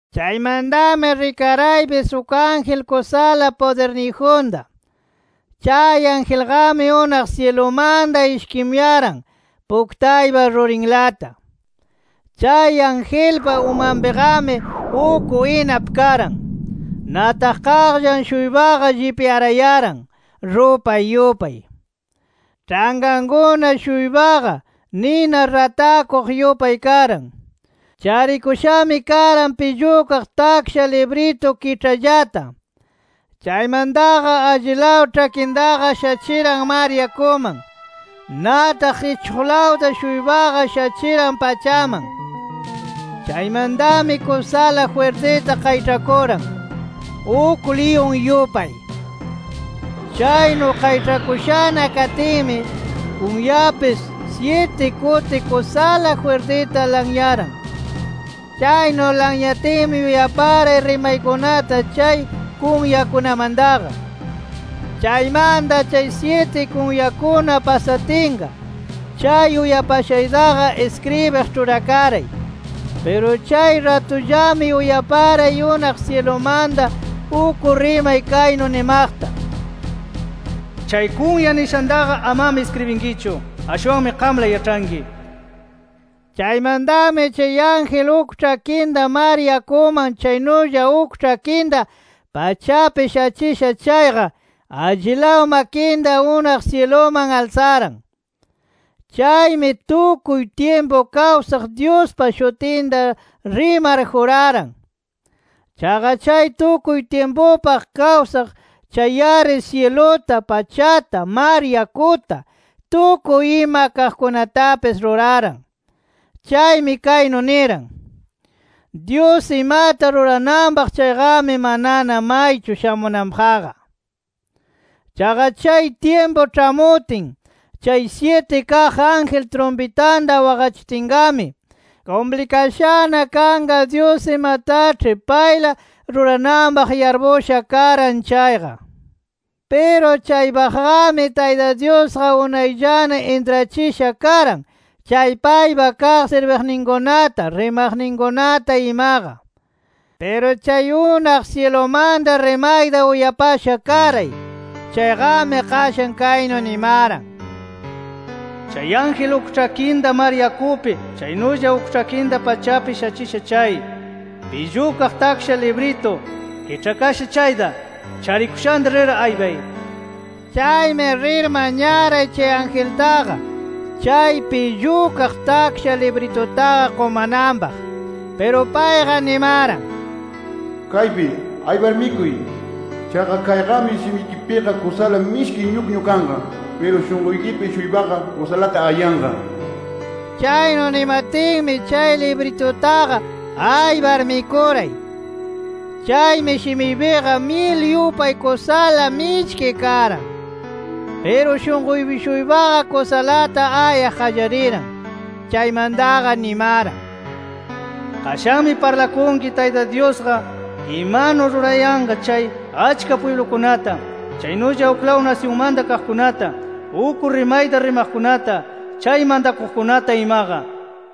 Chaymantami rikaraypis uk ángel kusala pudirniyjunta. Chay angelqami unaq syilumanta ishkimuyaran puktaypa rurinlata. Chay angelpa umanpiqami uk inap karan. Nataq qaqllan-shuypaqa llipyarayaran rupay yupay. Ĉhankankuna-shuypaqa, nina ratakuq yupay karan. Charikushami karan pillukaq taksha libritu kiĉhallata. Chaymantaqa allilaw ĉhakintaqa shachiran mar yakuman. Nataq ichuqlawta-shuypaqa shachiran pachaman. Chaymantami kusala jwirtita qayĉhakuran, uk liyun yupay. Chaynu qayĉhakushana katinmi, kunyapis syiti kuti kusala jwirtita lanyaran. Chaynu lanyatinmi uyaparay rimaykunata chay kunyakunamantaqa. Chaymanta chay syiti kunyakuna pasatinqa, chay uyapashaytaqa iskribiq ĉhurakaray. Piru chay ratullami uyaparay unaq syilumanta uk rimay kaynu nimaqta: “Chay kunya nishantaqa, amami iskribinkichu. Ashwanmi qamla yaĉhanki” nir. Chaymantami chay ángel uk ĉhakinta mar yakuman chaynulla uk ĉhakinta pachapi shachisha chayqa, allilaw makinta unaq syiluman alsaran. Chaymi, tukuy tyimpu kawsaq Dyuspa shutinta rimar juraran. Chaqa chay tukuy tyimpupaq kawsaq chay-ari syiluta, pachata, mar yakuta, tukuy ima kaqkunatapis ruraran. Chaymi kaynu niran: “Dyus imata rurananpaq chayqami manana maychu shamunanpaqqa. Chaqa chay tyimpu ĉhamutin chay syiti kaq ángel trumpitanta waqachitinqami, kumplikashana kanqa Dyus imataĉhi payla rurananpaq yarpusha karan chayqa. Piru chaypaqqami Tayta Dyusqa unayllana intrachisha karan chay paypa kaq sirbiqninkunata, rimaqninkunata imaqa”. Piru chay unaq syilumanta rimayta uyapasha karay, chayqami qashan kaynu nimaran: “Chay ángel uk ĉhakinta mar yakupi chaynulla uk ĉhakinta pachapi shachisha chay, pillukaq taksha libritu kiĉhakasha chayta charikushanta, rir aypay” nir. Chaymi rir mañaray chay angeltaqa chay pillukaq taksha libritutaqa qumananpaq. Piru payqa nimaran: “¡Kaypi! Aypar mikuy. Chaqa kayqami shimikipiqa kusala mishki ñukñu kanqa. Piru shunquykipi-shuypaqa kusalata ayanqa” nir. Chaynu nimatinmi, chay libritutaqa aypar mikuray. Chaymi, shimiypiqa myil yupay kusala mishki karan. Piru shunquypi-shuypaqa kusalata ayaq qallariran. Chaymantaqa nimaran: “Qashanmi parlakunki Tayta Dyusqa imanu rurayanqa chay achka pwiblukunata, chaynulla uklaw nasyunmanta kaqkunata, uk rimayta rimaqkunata, chay mantakuqkunata imaqa” nir.